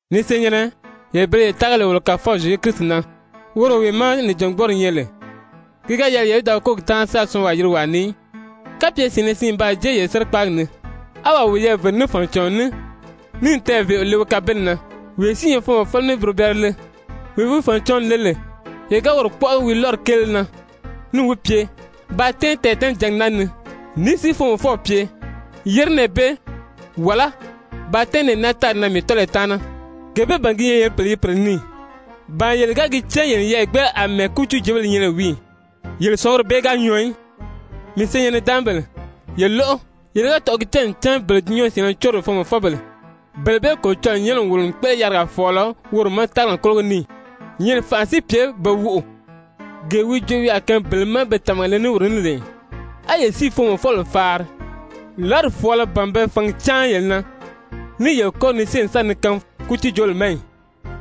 Ni senyɛ̀nnɛ, yele bele ye tága lè wolo Kàfɔw Zyezu Kirisi na, woro wee má nìjangbɔɔri nyɛ lè, ki ga yɛlɛ yele í da wi kólogi táanri sáā syɔɔnwaa yirigi wàa ni í. Kapye syɛ̀ɛnnɛ siin n baa jée yele sérikpaagi ni, á wàa wiyɛɛ vère ní fànicàɔn ní níì tɛɛ̀ vèʔeo le wi kabeli na, wee si i nyɛ foomɔfɔlɔ níì burobɛɛrɛ le, wee wi fànicǎnw le lè, yele ga woro kpɔ́ʔɔ wi lɔ́ri kéele na níì wi pye: «Ba tɛ́ɛn tɛɛ̀tɛ́nɛjǎngi naa ni,» ní si foomɔfɔw pye: «Yére nɛɛ bee,» wàlá: «Ba tɛ́ɛn nɛɛ naa tári na mii tɔ́lɔyi taana,» gee bee ban gi nyɛ yele i pèle yirigi pèle ni ì? Ba yele ga gi cán yele n yeyɛɛ gbéʔele àmɛɛ kútiijoobéle nyɛ lè wii ì? Yele sɔ̀nguri bee ga nyɔɔ í. Mii senyɛn-nidaanmabèle, ye lóʔo, yele ga tɔ̀ʔɔ̂ gi cán ncan bele dulunyanw syɛ̀ɛnnɛ córo lè foomɔfɔbèle, bele bee Kolocɔlɔɔ nyɛ́nɛ n wòlo n kpéʔele yarigaa fɔ̀ɔlɔ woro ma tágali kólogo ni ì? Nyɛ̀ʔɛni fànʔa si pye pe woʔò, gee wi joo wi a kaan bele má be tàmaga le ní woro ní lè ì? A yele si i foomɔfɔbèle faari! Lɔ́ri fɔ̀ɔlɔ ban be fǎngi cáan yele na, ní i yele kɔ́ri ni syée n sa ni kaangi kútiijoobèle ma ì?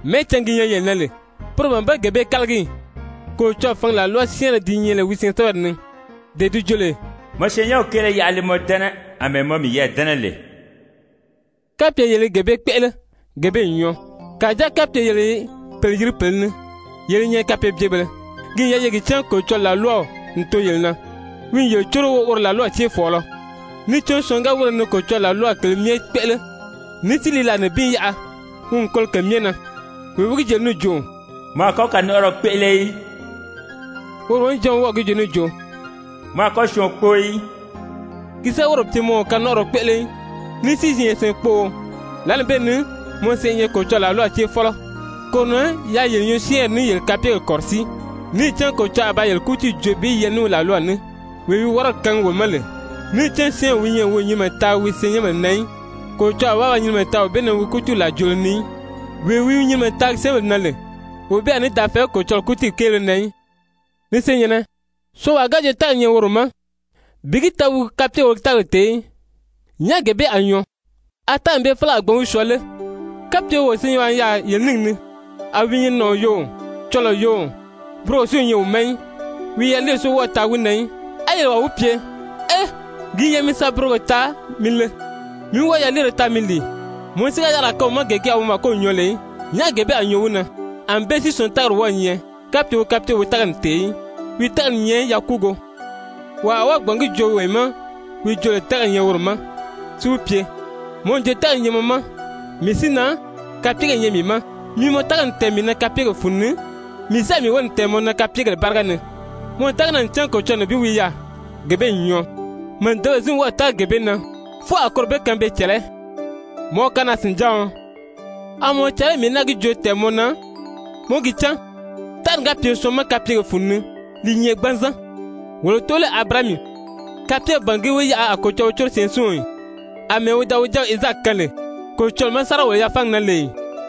Mɛ́ɛcǎngi gi nyɛ yele na lè, poro ban be gee bee kálagi ì? Kolocɔlɔɔ fǎngi làlwa syɛ́ɛnrɛ di nyɛ lè wi syɛɛnsɛbɛri ni, dee di joo lè: «Mɔ syɛɛnnyɛnw kéele yaʔa li mɔ dɛ́nɛ àmɛɛ mɔ miyɛɛ dɛ́nɛ lè,» kapye yele i gee bee kpéʔele, gee bee n nyɔɔ. Kàjáa kapye yele i pèle yirigi pèle ni, yele i nyɛ kapeebyebèlē. Ki n yɛlɛ ye gi cán Kolocɔlɔɔ làlwaw n too yele na, wi i yele córo woro làlwaw céefɔɔlɔ. Níì cán syɔɔn ga wíre ni Kolocɔlɔɔ làlwaw kèlē myɛ kpéʔele ní si li làa nibin yaʔa, wi n kolo ke myɛ na. Wee wi gi joo lè níì jo: «Mɔ a kɔ́ kanɔnʔɔrɔ kpéʔele í,» woro wonijanw wi wɔ́ɔ̀ gi joo níì jo: «Mɔ a kɔ́ syɔɔn kpóo í.» Ki si ga wírè pye mɔ o kanɔnʔɔrɔ kpéʔele í, ní si i nyɛ syɛɛnkpóō, lǎli bee ni mɔ sèʔé i nyɛ Kolocɔlɔɔ làlwaw céefɔlɔ. Koro na yaa yele nyɔɔsyɛɛnri ní yele kapyegèle kɔ̀rɔsíi, níì cán Kolocɔlɔɔ a ba yele kútiiw joo bi yɛlɛ ní wi làlwaw ní, wee wi wɔ́rɔdi kaangi wo ma lè, níì cán syɔ́ɔnwee wi nyɛ lè wi o nyinimɛ taagi wi syɛɛnnyɛnbèle na í, Kolocɔlɔɔ a wɔ́ɔ ba nyinimɛ taa wee bee na wi kútiiw làrijoolo ni í. Wee wi nyinimɛ taagi syɛ́ɛnbèle na lè, wee bee a ní da fɛ̀ɛgí Kolocɔlɔɔ kútiiw kéele na í. Ni senyɛ̀nnɛ, syɔɔnwaa ga joo tágali i nyɛ woro ma, bi gi taa wi kapyegèle o wi tágali tèé í, nyàʔá gee bee a nyɔɔ? A tágali bee félege a gbǎn wi syɔɔ lé? Kapye wo senyɛnwaa i yaà yele níngi ni, a wi i nyɛ nàɔn yoo, cɔlɔɔ yoo, burogo si o nyɛ wi ma í, wi yaliiri si wɔ́ɔ o taagi wi na í, á yele wàa wi pye: «Ee, ki n yɛlɛ mi sa burogo taa mi le, mí wɔ́ɔ yaliire taa mi lìi,» mɔ si ga yarigaa kaan wi ma gee ki a wi màkow nyɔɔ lè í, nyàʔá gee bee a nyɔɔ wi na? Anbée si syɔɔn tágali wɔ́ɔ̄ nyɛ, kapye wi kapyegèle o wi tágali tèé í, wi tágali i nyɛ yakuugo. Wàa a wɔ́ɔ gbǎn gi joo wee ma wi joo lè tágali i nyɛ woro ma, si wi pye: «Mɔ n joo tágali i nyɛ mɔ ma, mii si na, kapyegèle i nyɛ mii ma. Mi mɔ tágali tɛ̀ɛn mii na kapyegèle fun ni, mii si a mii wóli tɛ̀ɛn mɔ na mii kapyegèle báriga ni.» Mɔ n tága gi na ncan Kolocɔlɔɔ nibin wi yaà, gee bee n nyɔɔ. Màdebèle si n wɔ́ɔ̀ tága gee bee na, fwɔɔ a koro be kaan pe i cɛ̀lɛ́. Mɔ kanaa-sìnjáɔn, a mɔ i caa lé mii í náa gi joo tɛ̀ɛn mɔ na mɔ í gi cán, tágali ga pye syɔɔn ma kapyegèle fun ni, li i nyɛ gbanzan? Wolo tóolɛɛw Abirahami kapyegèle ban ge wi yaʔa a Kolocɔlɔɔ wi córo syɛɛnsiɔn ì, àmɛɛ wi da wi jáaw Izaaki kaan lè, Kolocɔlɔɔ ma sáriga sáriga-wòlo-yafaangi na lè ì?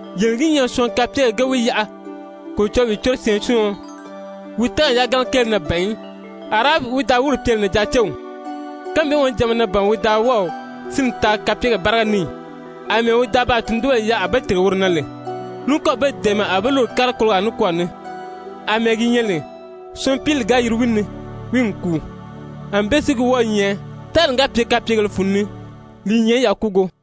Yele n gi nyaa syɔɔn kapyegèle ge wi yaʔa Kolocɔlɔɔ i wi córo syɛɛnsiɔn, wi tágali yagana kéele na ban í. Arahabi wi da wírè pye lè nànjaacew, kánmi bee wonijanma na ban wi da wɔ́ɔ̀ sínni taa kapyegèle báriga ni ì, àmɛɛ wi da baa tundunbèle yaʔa a be tìrige woro na lè, ní kɔ́ɔ̀ be dɛ̀ɛmɛ a be lúru n kári kologaa nikwɔɔ ni? Amɛɛ gi nyɛ lè, syɔɔn pili ga yiri wi ni, wi n kùu, ànbée si gi wɔ́ɔ̄ nyɛ, tágali ga pye kapyegèle fun ni, li i nyɛ yakuugo.